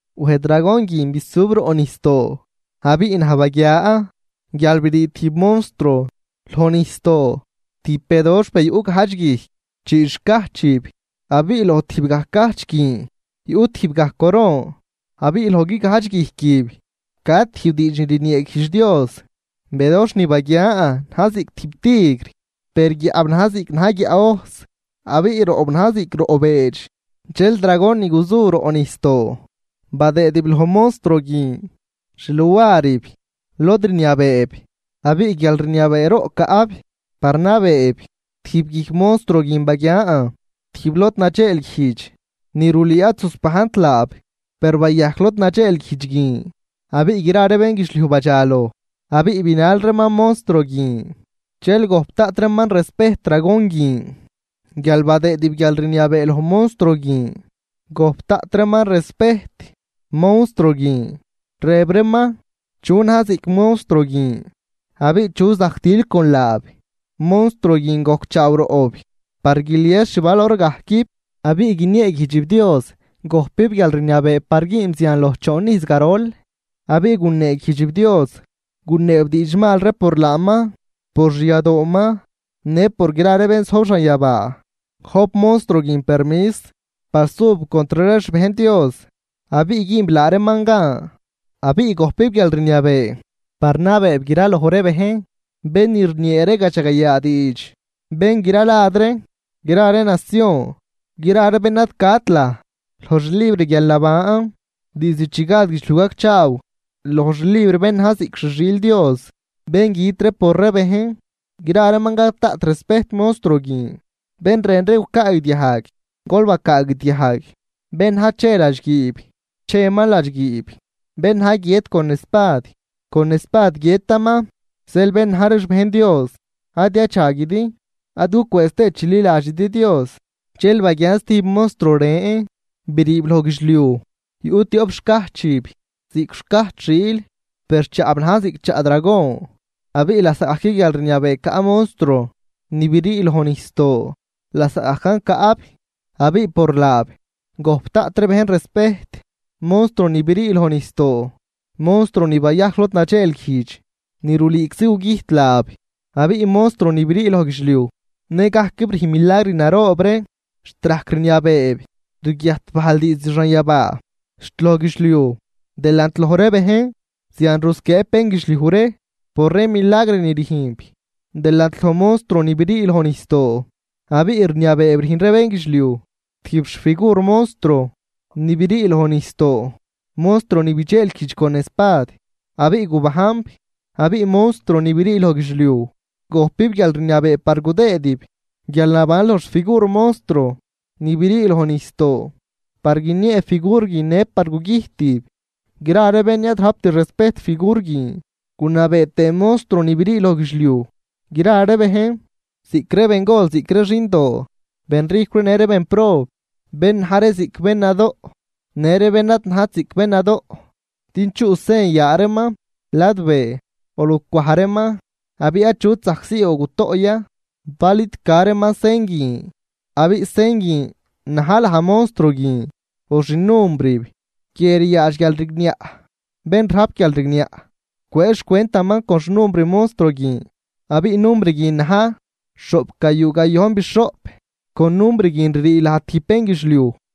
Wej dragon guin bisub roꞌ nijsdoo. Abiꞌ naj baguia guial brii tijb monstruo loj nijsdoo, tijb bedoxh be yuꞌ gajdx guijc, chii xcajchib abiꞌ loj tijb gaj cajch guin yuꞌ tijb gaj coron, abiꞌ loj guigajdx guijquib ca tijb diidx ni rnieeguijdx Dios. Bedoxh ni baguian na̱j ziꞌc tijb tigr, per guiaꞌb najn ziꞌc na̱j guiaꞌ ojs, abiꞌ roꞌb najn ziꞌc roꞌ beedx. Dxel dragon ni guzu roꞌ nijsdoo badëëdib loj monstruo guin xluarib lod rniabeeb abiꞌ guialrniabeeroꞌ caꞌb par nabeeb. Tijb guijc monstruo guin baguian tijb lod nadxeelguijdx ni rulüü ad zusbajnt laab, per bayajc lod nadxeelguijdx guin abiꞌ gra ree bénguidxliuj badxaloj abiꞌ binal reeman monstruo guin. Dxel gojp daꞌt reeman respejt dragon guin guial badëëdib guialrniabee loj monstruo guin gojp daꞌt tëë reeman respejt monstruo guin, rëb reeman: ―¿Chu na̱j ziꞌc monstruo guin abiꞌ chu zajc til con laab? Monstruo guin gojcchaaw roꞌb par guilies xvalor gajquib, abiꞌ guinieeguijdxib Dios, gojpib guialrniabee par güünb zian loj choon ijz garol. Abiꞌ guneeguijdxib Dios, guneeb diidxmal ree por laaman, por xyadooman në por gra ree bén zojb xanyabaa. Gojp monstruo guin permis par sub contr ree xbejn Dios abiꞌ güünb laa reeman gan. Abiꞌ gojpib guialrniabee par nabeeb graloj ree bejn, bén ni rniee ree gadxagayaa diidx, bén gra lad ree, gra ree nacion. Gra ree bén ad cat laj loj xlibr guialnaban diizd chi gad guidxliuj gacchaaw, loj xlibr bén na̱j ziꞌc xi xiil Dios bén güt por ree bejn, gra reeman gap daꞌt respejt monstruo guin. Bén rën ree gucaagdiajg, gol bacaagdiajg. Bén na̱j che ladxguiib, cheman ladxguiib. Bén na̱j guiët con espad, con espad guiëtaman. Zeel bén na̱j ree xbejn Dios ad yadxaguidi ad gucwëëz tëë chililadxidi Dios. Dxel baguian stijb monstruo ren briib loj guidxliuj, yuꞌ tioꞌp xcajchib ziꞌc xcajch xiil, per chaꞌb na̱j ziꞌc chaꞌ dragon. Abiꞌ lasaꞌgajc guialrniabee caꞌ monstruo ni brii loj nijsdoo lasaꞌgajcan caꞌb abiꞌ por laab gojp daꞌt ree bejn respejt monstruo ni brii loj nijsdoo, monstruo ni bayajc lod nadxeelguijdx ni rulüüczi gugüjt laab. Abiꞌ monstruo ni brii loj guidxliuj në gajquib rüjn milagr naroob ree, xt rajc rniabeeb rguiajt bajl diizd xanyabaa xt loj guidxliuj delant loj ree bejn. Zian rusquieeb bénguidxliuj ree por ree milagr ni rüjnb delant loj monstruo ni brii loj nijsdoo, abiꞌ rniabeeb rüjn ree bénguidxliuj tijb xfigur monstruo ni brii loj nijsdoo, monstruo ni bidxeelguijdx con espad abiꞌ gubajnb. Abiꞌ monstruo ni brii loj guidxliuj xt gojpib guialrniabee par gudëëdib guialnaban loj xfigur monstruo ni brii loj nijsdoo, par guiniee figur guin në par gugüjtib gra ree bén ni ad rajpt respejt figur guin. Gunabee tëë monstruo ni brii loj guidxliuj gra ree bejn, ziꞌc ree bengol ziꞌc ree xindoo, benrijcw ree në ree bénprob, bén na̱j ree ziꞌc bén nadoꞌ në ree bén ad najt ziꞌc bén nadoꞌ, din chuꞌ sen yaa reeman ladbee o lucwaj reeman. Abiꞌ achut zajc sii o gutoꞌ ya bal id ca reeman sen guin, abiꞌ sen guin na̱j laj monstruo guin o xinumbrib. Guie ryaadx guialrigniaꞌ. Bén rajp guialrigniaꞌ cwëë xcwentaman con xnumbr monstruo guin, abiꞌ numbr guin na̱j xhoꞌpgayuu gayojnbixhoꞌp. Con numbr guin ririi laj tijb bénguidxliuj.